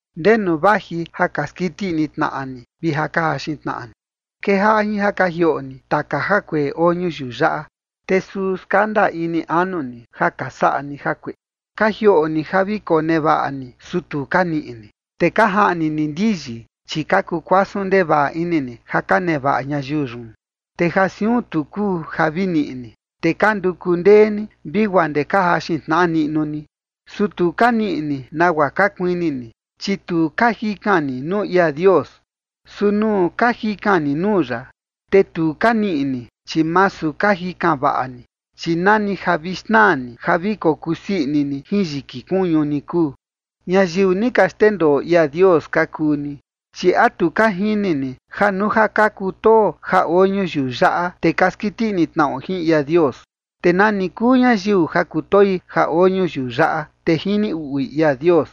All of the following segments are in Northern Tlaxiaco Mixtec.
¿Ndenu vaji ja ka skiti ini tnaꞌa ni vi ja ka jaxin tnaꞌa ni? Kejaꞌa jin ja ka jioꞌo ni taka jakueꞌe oo ñuyiu yaꞌa, te suu skanda ini anu ni, ja ka saꞌa ni jakueꞌe. Ka jioꞌo ni ja vi konevaꞌa ni, su tu ka niꞌi ni. Te ka jaꞌni ni ndiyi, chi ka kukuasun ndevaꞌa ini ni ja ka nevaꞌa ñayiu yun. Te ja siun tu kuu ja vi niꞌi ni, te ka nduku ndee ni, vi guaa ndee ka jaxin tnaꞌa niꞌnu ni. Su tu ka niꞌi ni nagua ka kuini ni, chi tu ka jikan ni nuu ia Dios. Su nuu ka jikan ni nuu ya, te tu ka niꞌi ni, chi masu ka jikan vaꞌa ni, chi nani ja vi xnaa ni ja vi kokusii ini ni jin yiki kuñu ni kuu. ¡Ñayiu ni ka xndendoo ia Dios ka kuu ni! Chi ¿a tu ka jini ni ja nuu ja ka kutoo ja oo ñuyiu yaꞌa, te ka skiti ini tnaꞌo jin ia Dios? Te nani kuu ñayiu ja kutoi ja oo ñuyiu yaꞌa, te jini uꞌui ia Dios.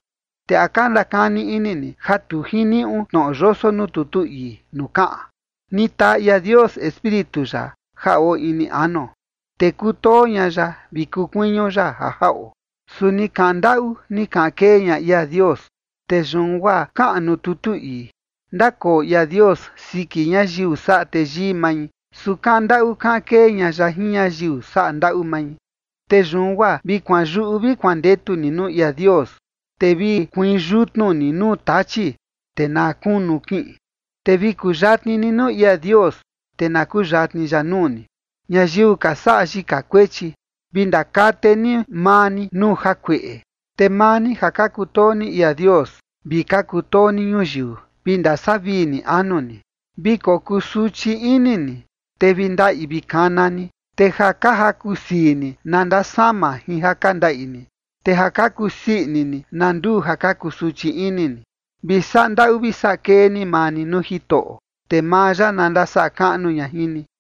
Te ¿a ka ndakani ini ni ja tu jiniuꞌu tnoꞌo yoso nuu tutu ii nuu kaꞌan: “Ni taa ia Dios Espíritu ya ja oo ini anuo, te kutoo ña ya vi kuu kuiñu ya ja jaꞌo”? Su ni kaꞌan ndaꞌu ni kaꞌan kee ña ia Dios, te yun guaa kaꞌan nuu tutu ii: “Ndakoo ia Dios siki ñayiu saꞌa teyii mai, su kaꞌan ndaꞌu kaꞌan kee ña ya jin ñayiu saꞌa ndaꞌu mai”. Te yun guaa vi kuanyuꞌu vi kuandetu ni nuu ia Dios, te vi kuiin yutnu ni nuu Tachi, te na kunu kiꞌin. Te vi kuyatni ni nuu ia Dios, te na kuyatni ya nuu ni. Ñayiu ka saꞌa yika kuechi, vi ndakate ni maa ni nuu jakueꞌe. Te maa ni ja ka kutoo ni ia Dios vi ka kutoo ni ñuyiu, vi ndasavii ni anu ni. Vi kokusuchi ini ni, te vi ndaꞌi vi kana ni, te ja ka jaku sii ni na ndasama jin ja ka ndaꞌi ni, te ja ka kusii ini ni na nduu ja ka kusuchi ini ni. Vi saꞌa ndaꞌu vi saꞌa kee ni maa ni nuu Jitoꞌo, te maa ya na ndasaꞌa kaꞌnu ña jin ni.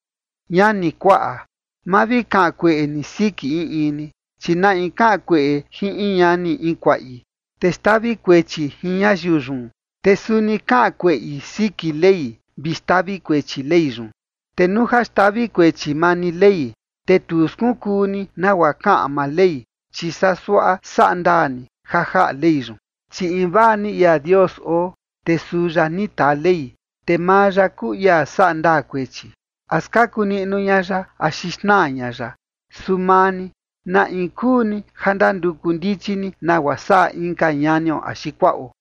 Ñani, kuaꞌa, ma vi kaꞌan kueꞌe ni siki in in ni, chi na in kaꞌan kueꞌe jin in ñani in kuaꞌi, te xtavi kuechi jin ñayiu yun, te suni kaꞌan kueꞌi siki Ley vi xtavi kuechi Ley yun. Te nuu ja xtavi kuechi maa ni Ley, te tu skunkuu ni nagua kaꞌan maa Ley, chi saa suaꞌa saꞌa ndaa ni ja jaꞌa Ley yun. Chi invaa ni ia Dios oo, te suu ya ni taa Ley, te maa ya kuu ia saꞌa ndaa kuechi, a skaku niꞌnu ña ya axi xnaa ña ya. Su maa ni, ¿na in kuu ni ja ndanduku ndichi ni nagua saꞌa inka ñanio axi kuaꞌo?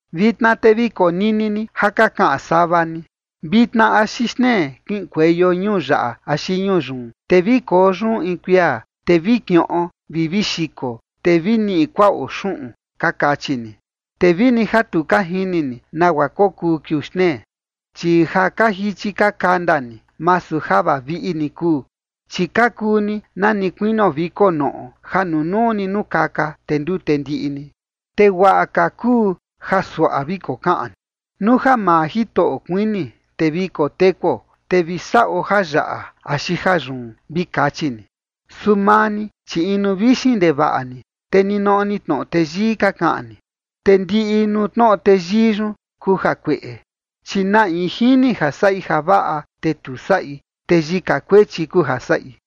Vitna te vi konini ni ja ka kaꞌan sava ni: “Vitna axi xtnee kiꞌinkueio ñuu yaꞌa axi ñuu yun, te vi koo yun in kuia, te vi kiꞌon vi vi xiko, te vi niꞌi kuaꞌo xuꞌun”, ka kachi ni. Te vini ja tu ka jini ni nagua kokuu kiuu xtnee. Chi ja ka jichi ka kanda ni, masu ja vaviꞌi ni kuu. Chi ka kuu ni nani kuinio viko noꞌo ja nunuu ni nukaka, te ndute ndiꞌi ni. Te guaꞌa ka kuu ja suaꞌa vi kokaꞌan ni: “Nuu ja maa Jitoꞌo kuini, te vi kotekuo, te vi saꞌo jayaꞌa axi jayun”, vi kachi ni. Su maa ni, chi inu vixin ndevaꞌa ni, te ninoꞌo ni tnoꞌo teyii ka kaꞌan ni. Te ndiꞌi nuu tnoꞌo teyii yun kuu jakueꞌe. Chi na in jini ja saꞌi javaꞌa te tu saꞌi, te yika kuechi kuu ja saꞌi.